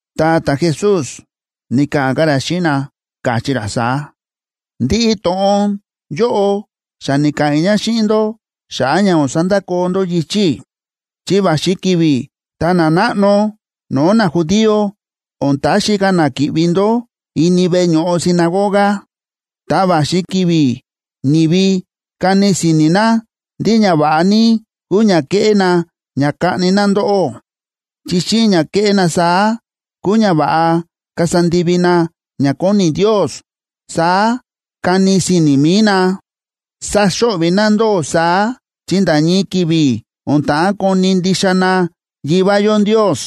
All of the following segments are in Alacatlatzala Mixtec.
Ta ta̱Jesús ni̱ka̱ꞌa̱n ka̱ ra xíꞌin na, káchí ra saá: ―Ndiꞌi to̱ꞌon yóꞌo xa ni̱ka̱ꞌa̱n i̱ ña xíꞌin ndó xa̱ꞌa̱ ña o̱n sandakoo ndó yichi̱ i̱. Chi va̱xi ki̱vi̱ tá nanáꞌno no̱o̱ najudío o̱n taxi ka̱ na ki̱ꞌvi ndó ini veꞌe ño̱ꞌo sinagoga. Ta va̱xi ki̱vi̱ ni̱vi kani si̱ni̱ na ndí ñava̱ꞌa ní kúu ña keꞌé na ña kaꞌni na ndóꞌó, chi xíꞌin ña kéꞌé na saá kúu ñava̱ꞌa kasa ndivi na ña kóni Ndios, saá kani si̱ni̱ mi̱i na. Saxo̱ꞌvi̱ na ndóꞌó saá, chi nda̱ ñii ki̱vi̱ o̱n ta̱ꞌán koni̱ ndixa na Yivá yó Ndios,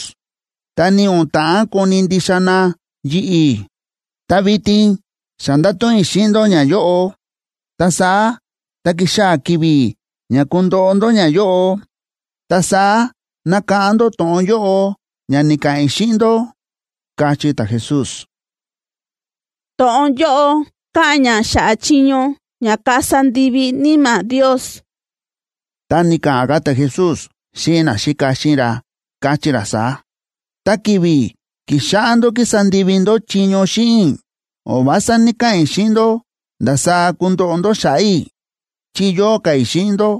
ta ni o̱n ta̱ꞌán koni̱ ndixa na yi̱ꞌi̱. Ta vitin xa nda̱to̱ꞌon i̱ xíꞌin ndó ñayóꞌo, ta saá tá kixaa̱ ki̱vi̱ ña kundoꞌo ndó ñayóꞌo, ta saá nakáꞌán ndó to̱ꞌon yóꞌo ña ni̱ka̱ꞌa̱n i̱ xíꞌin ndó ―káchí ta̱Jesús. To̱ꞌon yóꞌo káꞌa̱n ña xa̱ꞌa̱ chiño ña kasa ndivi Níma̱ Ndios Ta ni̱ka̱ꞌa̱n ka̱ ta̱Jesús xíꞌin naxíka xíꞌin ra, káchí ra saá: ―Ta ki̱vi̱ ki̱xáꞌá ndó kísa ndivi ndó chiño xíꞌin i̱, o̱n vása ní‑kaꞌa̱n i̱ xíꞌin ndó ndasaá kundoꞌo ndó xa̱ꞌa̱ i̱, chi yóo ka̱ i̱ xíꞌin ndó.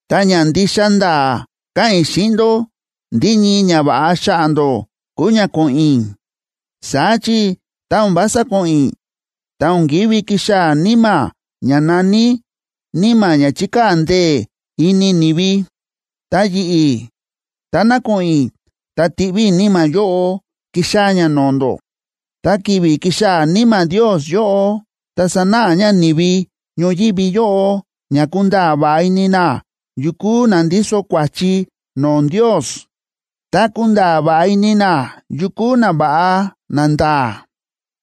Ta ña ndixa nda̱a̱ káꞌa̱n i̱ xíꞌin ndó ndí ñii ñava̱ꞌa xa̱ꞌa̱ ndó kúu ña ko̱ꞌo̱n i̱. Saá chi tá o̱n vása ko̱ꞌo̱n i̱, ta o̱n kívi kixaa̱ Níma̱ ña na̱ní Níma̱ ña chíkaa̱ ndee̱ ini ni̱vi. Ta yi̱ꞌi̱, táná ko̱ꞌo̱n i̱, ta tiꞌví i̱ Níma̱ yóꞌo kixaa̱ ña no̱o̱ ndó. Tá ki̱vi̱ kixaa̱ Níma̱ Ndios yóꞌo, ta sanáꞌa ña ni̱vi ñoyívi yóꞌo ña kunda̱a̱ va̱ꞌa ini na yu kúu na ndíso kua̱chi no̱o̱ Ndios, ta kunda̱a̱ va̱ꞌa ini na yu kúu nava̱ꞌa nanda̱a̱,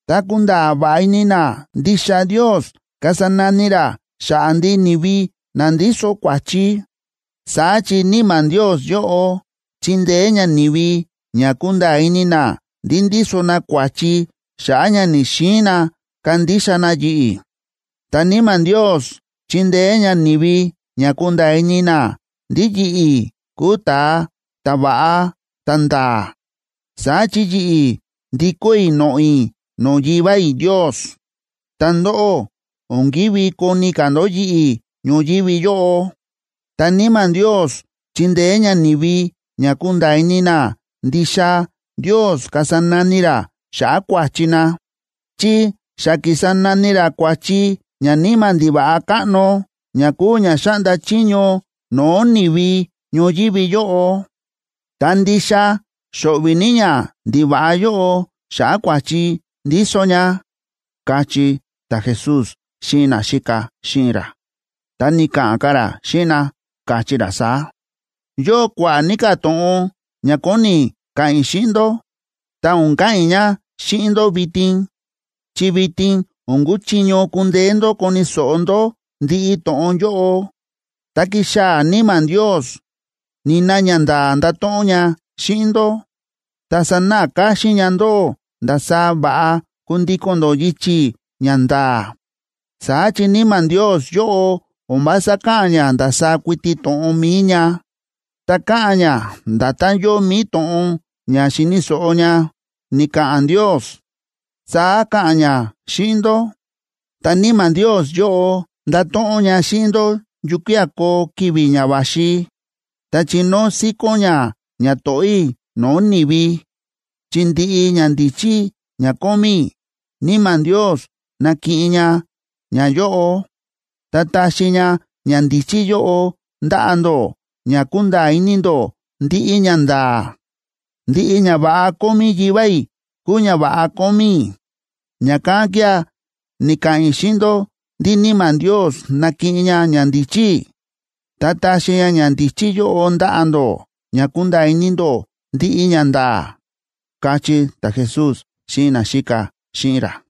ta kunda̱a̱ va̱ꞌa ini na ndixa Ndios kasa nani ra xa̱ꞌa̱ ndiꞌi ni̱vi na ndíso kua̱chi. Saá chi Níma̱ Ndios yóꞌo chindeé ña ni̱vi ña kunda̱a̱ ini na ndí ndíso na kua̱chi xa̱ꞌa̱ ña ni̱‑xiin na kandixa na yi̱ꞌi̱. Ta Níma̱ Ndios chindeé ña ni̱vi ña kunda̱a̱ ini na ndí yi̱ꞌi̱ kúu ta̱a ta̱va̱ꞌa ta̱nda̱a̱, saá chi yi̱ꞌi̱ ndikó i̱ noꞌo̱ i̱ no̱o̱ Yivá i̱ Ndios, ta ndóꞌó o̱n kívi koni ka̱ ndó yi̱ꞌi̱ ñoyívi yóꞌo. Ta Níma̱ Ndios chindeé ña ni̱vi ña kunda̱a̱ ini na ndixa Ndios kasa nani ra xa̱ꞌa̱ kua̱chi na, chi xa ki̱sa nani ra kua̱chi ñaníma̱ ndiva̱ꞌa káꞌno, ña kúu ña xáꞌnda chiño no̱o̱ ni̱vi ñoyívi yóꞌo, ta ndixa xo̱ꞌvi̱ ní ñandiva̱ꞌa yóꞌo xa̱ꞌa̱ kua̱chi ndíso ña ―káchí ta̱Jesús xíꞌin naxíka xíꞌin ra. Ta ni̱ka̱ꞌa̱n ka̱ ra xíꞌin na, káchí ra saá: ―Yóo kua̱ꞌa̱ ní ka̱ to̱ꞌon ña kóni i̱ ka̱ꞌa̱n i̱ xíꞌin ndó, ta o̱n ka̱ꞌa̱n i̱ ña xíꞌin ndó vitin, chi vitin o̱n kuchiño kundeé ndó koni̱ so̱ꞌo ndó ndiꞌi to̱ꞌon yóꞌo. Tá kixaa̱ Níma̱ Ndios, nina ñanda̱a̱ ndato̱ꞌon ña xíꞌin ndó, ta sanáꞌa káxín ña ndóꞌó ndasaá va̱ꞌa kundíko̱n ndó yichi̱ ña nda̱a̱. Saá chi Níma̱ Ndios yóꞌo o̱n vása ka̱ꞌa̱n ña ndasaá kuiti to̱ꞌon mi̱i ña, ta ka̱ꞌa̱n ña nda̱tán yóo mi̱i to̱ꞌon ña xi̱ni̱ so̱ꞌo ña ni̱ka̱ꞌa̱n Ndios, saá ka̱ꞌa̱n ña xíꞌin ndó. Ta Níma̱ Ndios yóꞌo ndato̱ꞌon ña xíꞌin ndó yukía̱ koo ki̱vi̱ ña va̱xi. Ta chinóo síkón ña ñato̱ꞌó i̱ no̱o̱ ni̱vi, chi ndiꞌi ñandíchí ña kómí i̱, Níma̱ Ndios nakiꞌin ña ñayóꞌo, ta taxi ña ñandíchí yóꞌo ndaꞌa̱ ndó ña kunda̱a̱ ini ndó ndiꞌi ñanda̱a̱. Ndiꞌi ñava̱ꞌa kómí Yivá i̱ kúu ñava̱ꞌa kómí i̱. Ña̱kán kía̱ ni̱ka̱ꞌa̱n i̱ xíꞌin ndó ndí Níma̱ Ndios nakiꞌin ña ñandíchí i̱, ta taxi ñandíchí yóꞌo ndaꞌa̱ ndó ña kunda̱a̱ ini ndó ndiꞌi ñanda̱a̱ ―káchí ta̱Jesús xíꞌin naxíka xíꞌin ra.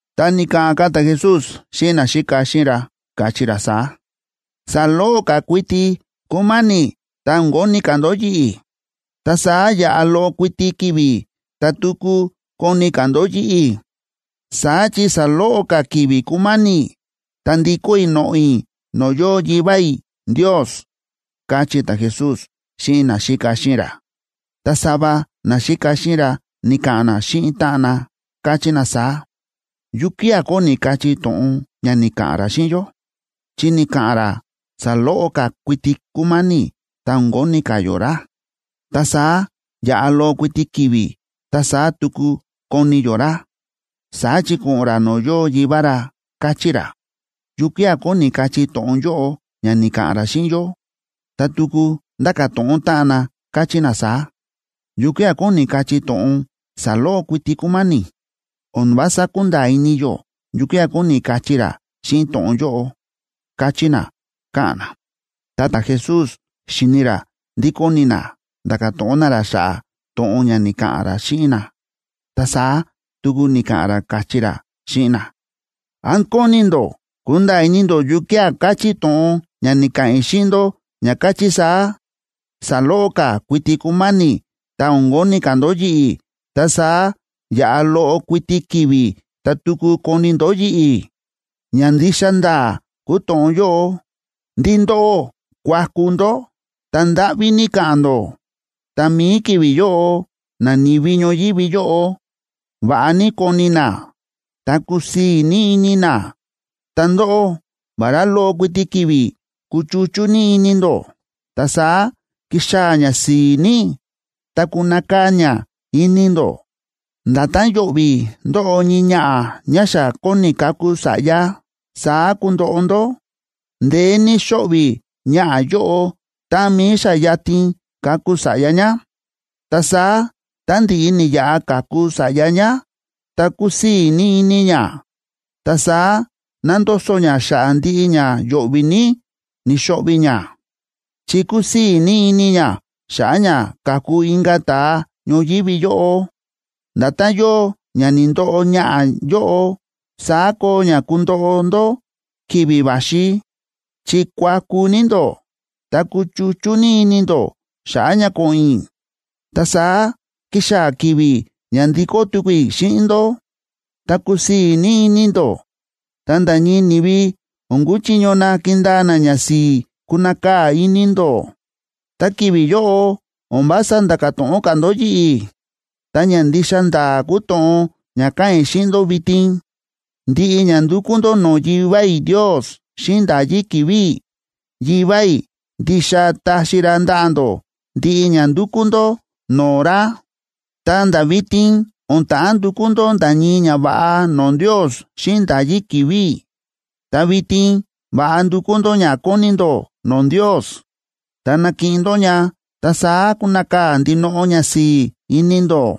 Ta ni̱ka̱ꞌa̱n ka̱ ta̱Jesús xíꞌin naxíka xíꞌin ra, káchí ra saá: ―Saloꞌo ka̱ kuiti kúma̱ni̱ ta o̱n koni ka̱ ndó yi̱ꞌi̱, ta saá yaꞌa loꞌo kuiti ki̱vi̱ ta tuku koni ka̱ ndó yi̱ꞌi̱. Saá chi saloꞌo ka̱ ki̱vi̱ kúma̱ni̱, ta ndikó i̱ noꞌo̱ i̱ no̱o̱ yóo Yivá i̱ Ndios ―káchí ta̱Jesús xíꞌin naxíka xíꞌin ra. Ta sava naxíka xíꞌin ra ni̱ka̱ꞌa̱n na xíꞌin táꞌan na, káchí na saá: ―¿Yukía̱ kóni kachí to̱ꞌon ña ni̱ka̱ꞌa̱n ra xíꞌin yó? Chi ni̱ka̱ꞌa̱n ra saloꞌo ka̱ kuiti kúma̱ni̱ ta o̱n koni ka̱ yó ra. Ta saá yaꞌa loꞌo kuiti ki̱vi̱ ta saá tuku koni yó ra, saá chi ko̱ꞌo̱n ra no̱o̱ yóo Yivá ra, káchí ra. ¿Yukía̱ kóni kachí to̱ꞌon yóꞌo ña ni̱ka̱ꞌa̱n ra xíꞌin yó? Ta tuku ndáka̱ to̱ꞌon táꞌan na, káchí na saá: ―¿Yukía̱ kóni kachí to̱ꞌon “saloꞌo kuiti kúma̱ni̱”? O̱n vása kúnda̱a̱ ini yó yukía̱ kóni kachí ra xíꞌin to̱ꞌon yóꞌo ―káchí na, káꞌa̱n na. Ta ta̱Jesús xíni̱ ra ndí kóni na nda̱ka̱ to̱ꞌon na ra xa̱ꞌa̱ to̱ꞌon ña ni̱ka̱ꞌa̱n ra xíꞌin na, ta saá tuku ni̱ka̱ꞌa̱n ra, káchí ra xíꞌin na: ―¿Án kóni ndó kunda̱a̱ ini ndó yukía̱ káchí to̱ꞌon ña ni̱ka̱ꞌa̱n i̱ xíꞌin ndó ña káchí saá: “Saloꞌo ka̱ kuiti kúma̱ni̱ ta o̱n koni ka̱ ndó yi̱ꞌi̱, ta saá yaꞌa loꞌo kuiti ki̱vi̱ ta tuku koni ndó yi̱ꞌi̱”? Ña ndixa nda̱a̱ kúu to̱ꞌon yóꞌo ndí ndóꞌó kuaku ndó ta ndáꞌví ní ka̱ꞌa̱n ndó, ta mi̱i ki̱vi̱ yóꞌo nani̱vi ñoyívi yóꞌo va̱ꞌa ní koni na, ta kusii̱ ní ini na. Ta ndóꞌó, vará loꞌo kuiti ki̱vi̱ kuchuchú ní ini ndó, ta saá kixaa̱ ñasi̱i̱ ní, ta kunakaa̱ ña ini ndó. Nda̱tán yo̱ꞌvi̱ ndóꞌo ñii ñaꞌa̱ ñá xa kóni kaku sa̱ꞌya, saá kundoꞌo ndó. Ndeé ní xóꞌvi̱ ñaꞌa̱ yóꞌo táꞌan mi̱i xa yatin kaku sa̱ꞌya ñá. Ta saá, tá ndi̱ꞌi ni̱yaꞌa ka̱ku sa̱ꞌya ñá, ta kúsii̱ ní ini ñá. Ta saá nándoso ñá xa̱ꞌa̱ ndiꞌi ña yo̱ꞌvi̱ ní ni̱xo̱ꞌvi̱ ñá, chi kúsii̱ ní ini ñá xa̱ꞌa̱ ña ka̱ku inka̱ ta̱a ñoyívi yóꞌo. Nda̱tán yóo ña ni̱ndoꞌo ñaꞌa̱ yóꞌo, saá koo ña kundoꞌo ndó ki̱vi̱ va̱xi, chi kuaku ní ndó ta kuchuchú ní ini ndó xa̱ꞌa̱ ña ko̱ꞌo̱n i̱. Ta saá kixaa̱ ki̱vi̱ ña ndikó tuku i̱ xíꞌin ndó, ta kusii̱ ní ini ndó, ta nda̱ ñii ni̱vi o̱n kuchiño na kindaa na ñasi̱i̱ kunakaa̱ ini ndó. ’Ta ki̱vi̱ yóꞌo o̱n vása ndáka̱ to̱ꞌon ka̱ ndó yi̱ꞌi̱. Ta ña ndixa nda̱a̱ kúu to̱ꞌon ña káꞌa̱n i̱ xíꞌin ndó vitin: Ndiꞌi ña ndukú ndó no̱o̱ Yivá i̱ Ndios xíꞌin nda̱yí ki̱vi̱ i̱, Yivá i̱ ndixa taxi ra ndaꞌa̱ ndó ndiꞌi ña ndúkú ndó no̱o̱ ra. Ta nda̱ vitin o̱n ta̱ꞌán ndukú ndó nda̱ ñii ñava̱ꞌa no̱o̱ Ndios xíꞌin nda̱yí ki̱vi̱ i̱. Ta vitin va̱ꞌa ndukú ndó ña kóni ndó no̱o̱ Ndios, ta nakiꞌin ndó ña, ta saá kunakaa̱ ndinoꞌo ñasi̱i̱ ini ndó.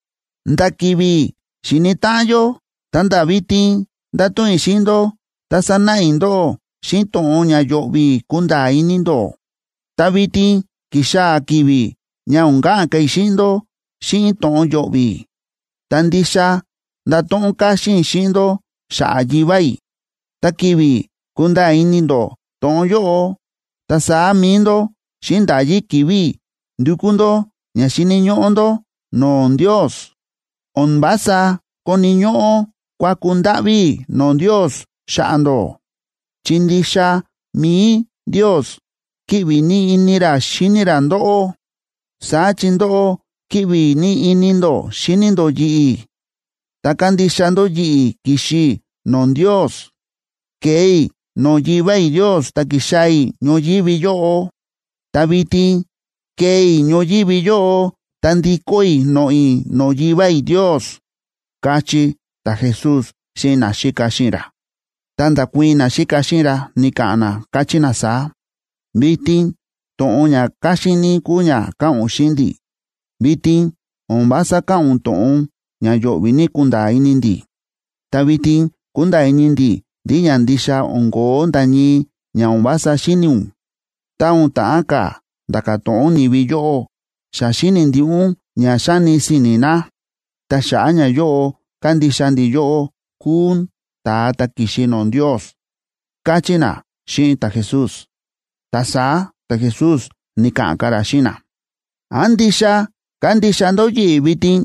’Nda̱ ki̱vi̱ xíni táꞌan yó ta̱nda̱ vitin nda̱to̱ꞌon i̱ xíꞌin ndó ta sa̱náꞌa i̱ ndóꞌó xíꞌin to̱ꞌon ña yo̱ꞌvi̱ kunda̱a̱ ini ndó. Ta vitin ki̱xaa̱ ki̱vi̱ ña o̱n ka̱ꞌa̱n ka̱ i̱ xíꞌin ndó xíꞌin to̱ꞌon yo̱ꞌvi̱, ta ndixa ndato̱ꞌon káxín i̱ xíꞌin ndó xa̱ꞌa̱ Yivá i̱. Ta ki̱vi̱ kunda̱a̱ ini ndó to̱ꞌon yóꞌo, ta saá mi̱i ndó, xíꞌin nda̱yí ki̱vi̱ i̱, ndukú ndó ña xíni̱ ñóꞌó ndó no̱o̱ Ndios. O̱n vása koni̱ ñóꞌó kuaku ndáꞌví i̱ no̱o̱ Ndios xa̱ꞌa̱ ndó, chi ndixa mi̱i Ndios kíꞌvi ní ini ra xíni ra ndóꞌó. Saá chi ndóꞌó kíꞌvi ní ini ndó xíni ndó yi̱ꞌi̱, ta kándixa ndó yi̱ꞌi̱ ki̱xi i̱ no̱o̱ Ndios. Ke̱e i̱ no̱o̱ Yivá i̱ Ndios ta ki̱xaa̱ i̱ ñoyívi yóꞌo. Ta vitin kee i̱ ñoyívi yóꞌo ta ndikó i̱ noꞌo̱ i̱ no̱o̱ Yivá i̱ Ndios ―káchí ta̱Jesús xíꞌin naxíka xíꞌin ra. Ta nda̱kuii̱n naxíka xíꞌin ra, ni̱ka̱ꞌa̱n na, káchí na saá: ―Vitin to̱ꞌon ña káxín ní kúu ña káꞌa̱n ún xíꞌin ndi̱. Vitin o̱n vása káꞌa̱n ún to̱ꞌon ña yo̱ꞌvi̱ ní kunda̱a̱ ini ndi̱. Ta vitin kúnda̱a̱ ini ndi̱ ndí ña ndixa o̱n ko̱ó nda̱ ñii ña o̱n vása xíni̱ ún. Tá o̱n ta̱ꞌán ka̱ nda̱ka̱ to̱ꞌon ni̱vi yóꞌó, xa xíni̱ ndiꞌi ún ña xáni si̱ni̱ na. Ta xa̱ꞌa̱ ñayóꞌo kándixa ndi̱ yóꞌó kúu ún ta̱a ta̱ ki̱xi no̱o̱ Ndios ―káchí na xíꞌin ta̱Jesús. Ta saá ta̱Jesús ni̱ka̱ꞌa̱n ka̱ ra xíꞌin na: ―¿Án ndixa kándixa ndó yi̱ꞌi̱ vitin?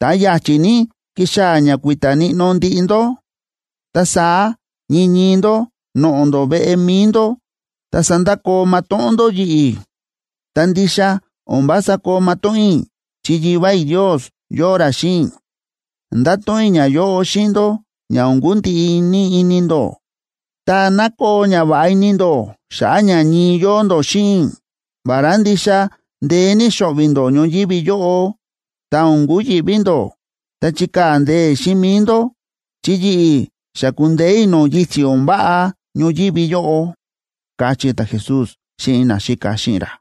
Ta ya̱chi̱ ní kixaa̱ ña kui̱ta̱ níꞌnó ndiꞌi ndó, ta saá ñii ñii ndó noꞌo̱ ndó veꞌe mi̱i ndó. Ta sandakoo matóꞌón ndó yi̱ꞌi̱. Ta ndixa o̱n vása koo matóꞌón i̱ chi Yivá i̱ Ndios yóo ra xíꞌin i̱. Nda̱to̱ꞌon i̱ ñayóꞌo xíꞌin ndó ña o̱n kundiꞌi ní ini ndó, ta ná koo ñava̱ꞌa ini ndó xa̱ꞌa̱ ña ñii yóo ndó xíꞌin i̱. Vará ndixa ndeé ní xo̱ꞌvi̱ ndó ñoyívi yóꞌo, ta o̱n kuyi̱ꞌví ndó ta chikaa̱ ndee̱ xíꞌin mi̱i ndó, chi yi̱ꞌi̱ xa ku̱ndeé i̱ no̱o̱ yichi̱ o̱n váꞌa ñoyívi yóꞌo ―káchí ta̱Jesús xíꞌin naxíka xíꞌin ra.